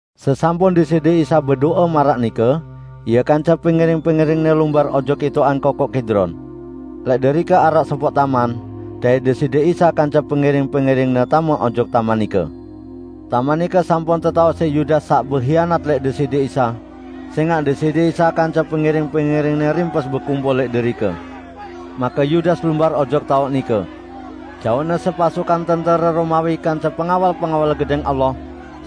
Sesampun Deside Isa bedo'e maraq nike, Ie kance pengiring-pengiring-Ne lumbar ojok itoqan Kokoq Kidron. Lẽq derike araq sopoq taman, dait Deside Isa kance pengiring-pengiring-Ne tame ojok taman nike. Taman nike sampun tetaoq siq Yudas saq behianat lẽq Deside Isa; sẽngaq Deside Isa kance pengiring-pengiring-Ne rimpes bekumpul lẽq derike. Make Yudas lumbar ojok taoq nike. Jauqne sepasukan tentere Romawi kance pengawal-pengawal Gedẽng Allah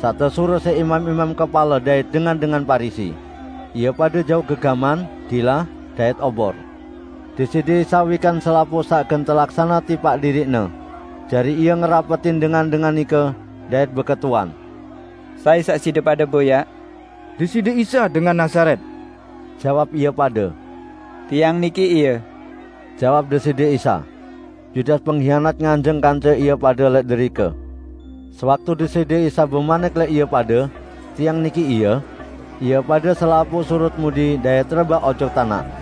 saq tesuruq siq imam-imam kepale dait dengan-dengan Parisi. Ie pade jauq gegaman, dilah dait obor. Deside Isa wikan selapuq saq gen telaksane tipaq diriq-Ne. Jari Ie ngerapetin dengan-dengan nike, dait beketuan, "Sai saq side pade boyaq?" "Deside Isa, dengan Nazaret," jawab ie pade. "Tiang niki Ie," jawab Deside Isa. Yudas penghianat nganjeng kance ie pade lẽq derike. Sewaktu Deside Isa bemanik lẽq ie pade, "Tiang niki Ie," ie pade selapuq surut mudi dait rebaq ojok tanaq.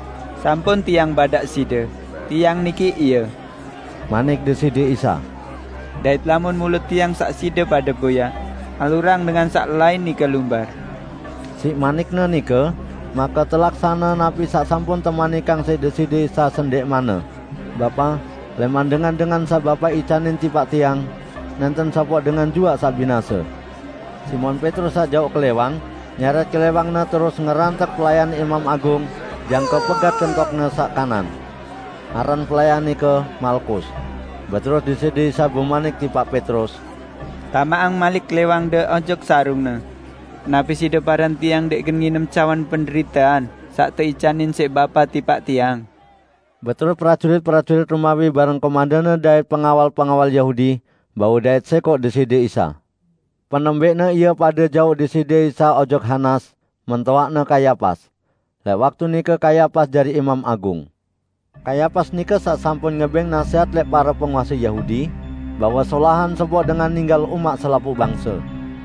"Sampun Tiang badaq side, Tiang niki Ie," manik Deside Isa. "Dait lamun mule Tiang saq side pade boyaq, alurang dengan saq lain nike lumbar." ( Siq manik-Ne nike, make telaksane napi saq sampun temanikang siq Deside Isa sendẽqmanne: "Bapa, lẽman dengan-dengan saq Bapa icanin tipaq Tiang, nẽnten sopoq dengan juaq saq binase.") Simon Petrus saq jauq klẽwang, nyerẽt klẽwangne terus ngerantek pelayan Imam Agung jangke pegat kentokne saq kanan. Aran pelayan nike Malkus. Beterus Deside Isa bemanik tipaq Petrus, "Tamaqang malik klẽwangde ojok sarungne! Napi side paran Tiang ndẽq gen nginem cawan penderitean saq teicanin siq Bapa tipaq Tiang?" Beterus prajurit-prajurit Romawi bareng komendanne dait pengawal-pengawal Yahudi bau dait sẽkoq Deside Isa. Penembẽqne ie pade jauq Deside Isa ojok Hanas, mentoaqne Kayapas. Lẽq waktu nike Kayapas jari Imam Agung. Kayapas nike saq sampun ngebẽng nasẽhat lẽq pare penguase Yahudi bahwe solahan sopoq dengan ninggal umaq selapuq bangse.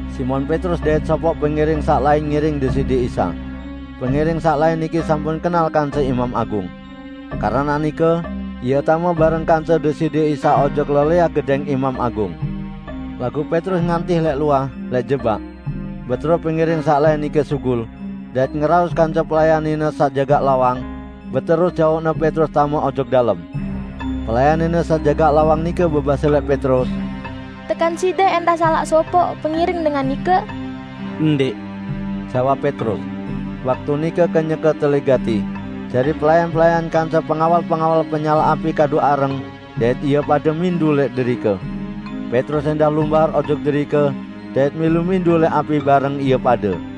Simon Petrus dait sopoq pengiring saq lain ngiring Deside Isa. Pengiring saq lain niki sampun kenal kance Imam Agung. Keranaq nike, ie tame bareng kance Deside Isa ojok lelẽah gedẽng Imam Agung, laguq Petrus ngantih lẽq luah, lẽq jebak. Beterus pengiring saq lain nike sugul, dait ngeraos kance pelayan nine saq jagaq lawang, beterus jauqne Petrus tame ojok dalem. Pelayan nine saq jagaq lawang nike bebase lẽq Petrus, "Tekan side ẽndah salaq sopoq pengiring dengan nike?" "Ndẽq," jawab Petrus. Waktu nike kenyeke telih gati, jari pelayan-pelayan kance pengawal-pengawal penyalaq api kadu areng dait ie pade mindu lẽq derike. Petrus ẽndah lumbar ojok derike dait milu mindu lẽq api bareng ie pade.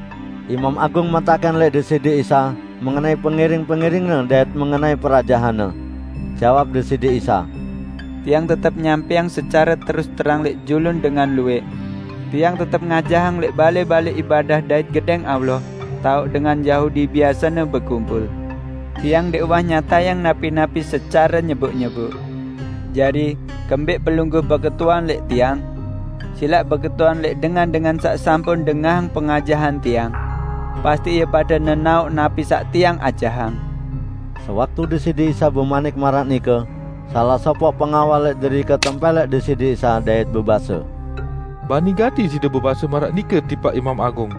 Imam Agung metakẽn lẽq Deside Isa mengenai pengiring-pengiring-Ne dait mengenai perajahan-Ne. Jawab Deside Isa, "Tiang tetep nyampẽang secare terus terang lẽq julun dengan luwẽq. Tiang tetep ngajahang lẽq balẽ-balẽ ibadah dait Gedẽng Allah, taoq dengan Yahudi biasene bekumpul. Tiang ndẽq uwah nyatayang napi-napi secare nyeboq-nyeboq. Jari, kembẽq pelungguh beketuan lẽq Tiang? Silaq beketuan lẽq dengan-dengan saq sampun dengahang pengajahan Tiang. Pasti ie pade nenaoq napi saq Tiang ajahang." Sewaktu Deside Isa bemanik maraq nike, salaq sopoq pengawal lẽq derike tempẽlẽk Deside Isa dait bebase, "Bani gati Side bebase maraq nike tipaq Imam Agung!"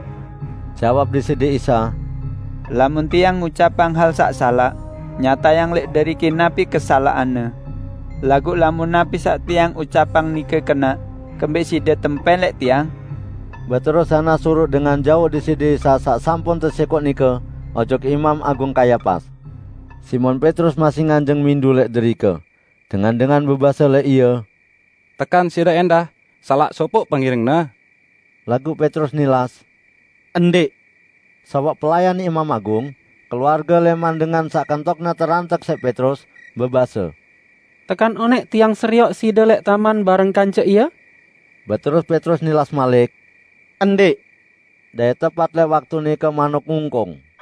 Jawab Deside Isa, "Lamun Tiang ngucapang hal saq salaq, nyatayang lẽq deriki napi kesalaqanne! Laguq lamun napi saq Tiang ucapang nike kenaq, kembẽq side tempẽlẽk Tiang?" Beterus Hanas suruq dengan jauq Deside Isa saq sampun tesẽkoq nike ojok Imam Agung Kayapas. Simon Petrus masih nganjeng mindu lẽq derike. Dengan-dengan bebase lẽq ie, "Tekan side ẽndah salaq sopoq pengiring-Ne?" Laguq Petrus nilas, "Ndẽq!" Sopoq pelayan Imam Agung, keluarge lẽman dengan saq kentokne terantek siq Petrus, bebase, "Tekan onẽq tiang serioq side lẽq taman bareng kance Ie?" Beterus Petrus nilas malik, "Ndẽq," -- dait tepat lẽq waktu nike manuk ngungkung.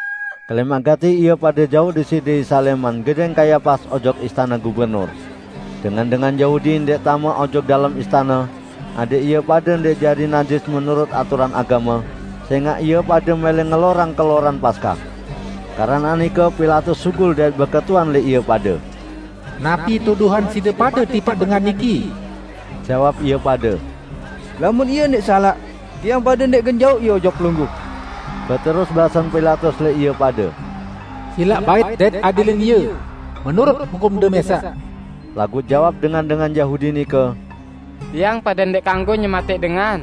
Kelẽmaq gati ie pade jauq Deside Isa lẽman gedẽng Kayapas ojok istane gubernur. Dengan-dengan Yahudi ndẽq tame ojok dalem istane, adẽq ie pade ndẽq jari najis menurut aturan agame, sẽngaq ie pade mẽlẽ ngelorang keloran Paskah. Keranaq nike Pilatus sugul dait beketuan lẽq ie pade, "Napi tuduhan side pade tipaq dengan niki?" Jawab ie pade, "Lamun Ie ndẽq salaq, tiang pade ndẽq gen jauq Ie ojok pelungguh." Beterus basen Pilatus lẽq ie pade, "Silaq bait dait adilin Ie menurut hukumde mẽsaq!" Laguq jawab dengan-dengan Yahudi nike, "Tiang pade ndẽq kanggo nyematẽq dengan." (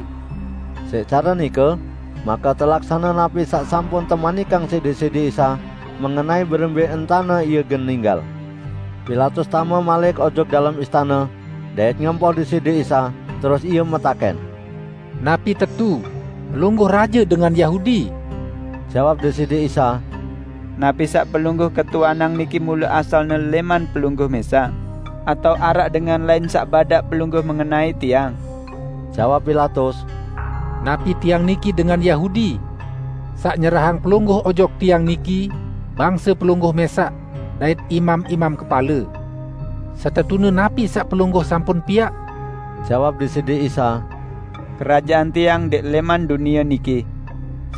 Siq care nike, make telaksane napi saq sampun temanikang siq Deside Isa mengenai berembẽ entane Ie gen ninggal.) Pilatus tame malik ojok dalem istane, dait ngempoh Deside Isa, terus ie metakẽn, "Napi tetu Pelungguh raje dengan Yahudi?" Jawab Deside Isa, "Napi saq pelungguh ketuanang niki mule asalne lẽman pelungguh mẽsaq atao araq dengan lain saq badaq pelungguh mengenai Tiang?" Jawab Pilatus, "Napi tiang niki dengan Yahudi? Saq nyerahang Pelungguh ojok tiang niki bangse Pelungguh mẽsaq dait imam-imam kepale. Setetune napi saq Pelungguh sampun piaq?" Jawab Deside Isa, "Kerajaan Tiang ndẽq lẽman dunie niki.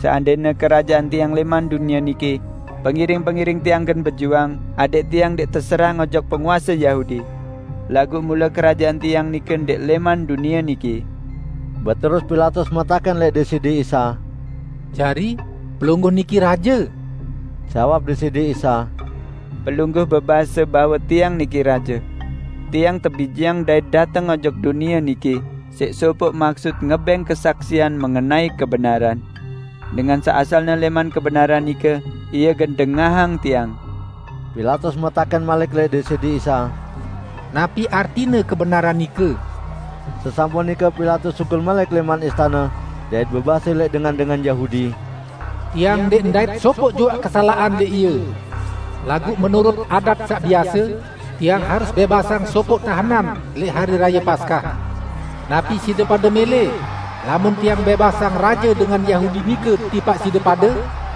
Seandẽne kerajaan Tiang lẽman dunie niki, pengiring-pengiring Tiang gen bejuang adẽq Tiang ndẽq teserahang ojok penguase Yahudi. Laguq mule kerajaan Tiang nike ndẽq lẽman dunie niki!" Beterus Pilatus metakẽn lẽq Deside Isa, "Jari, Pelungguh niki Raje?" Jawab Deside Isa, "Pelungguh bebase bahwe Tiang niki Raje. Tiang tebijeang dait dateng ojok dunie niki siq sopoq maksut, ngebẽng kesaksian mengenai kebenaran. Dengan saq asalne lẽman kebenaran nike ie gen dengahang Tiang." Pilatus metakẽn malik lẽq Deside Isa, "Napi artine kebenaran nike?" Sesampun nike Pilatus sugul malik lẽman istane dait bebase lẽq dengan-dengan Yahudi, "Tiang ndẽq ndait sopoq juaq kesalaqan lẽq Ie. Laguq menurut adat saq biase, tiang harus bẽbasang sopoq tahenan lẽq Hari Raye Paskah. Napi side pade mẽlẽ lamun tiang bẽbasang Raje dengan Yahudi nike tipaq side pade?"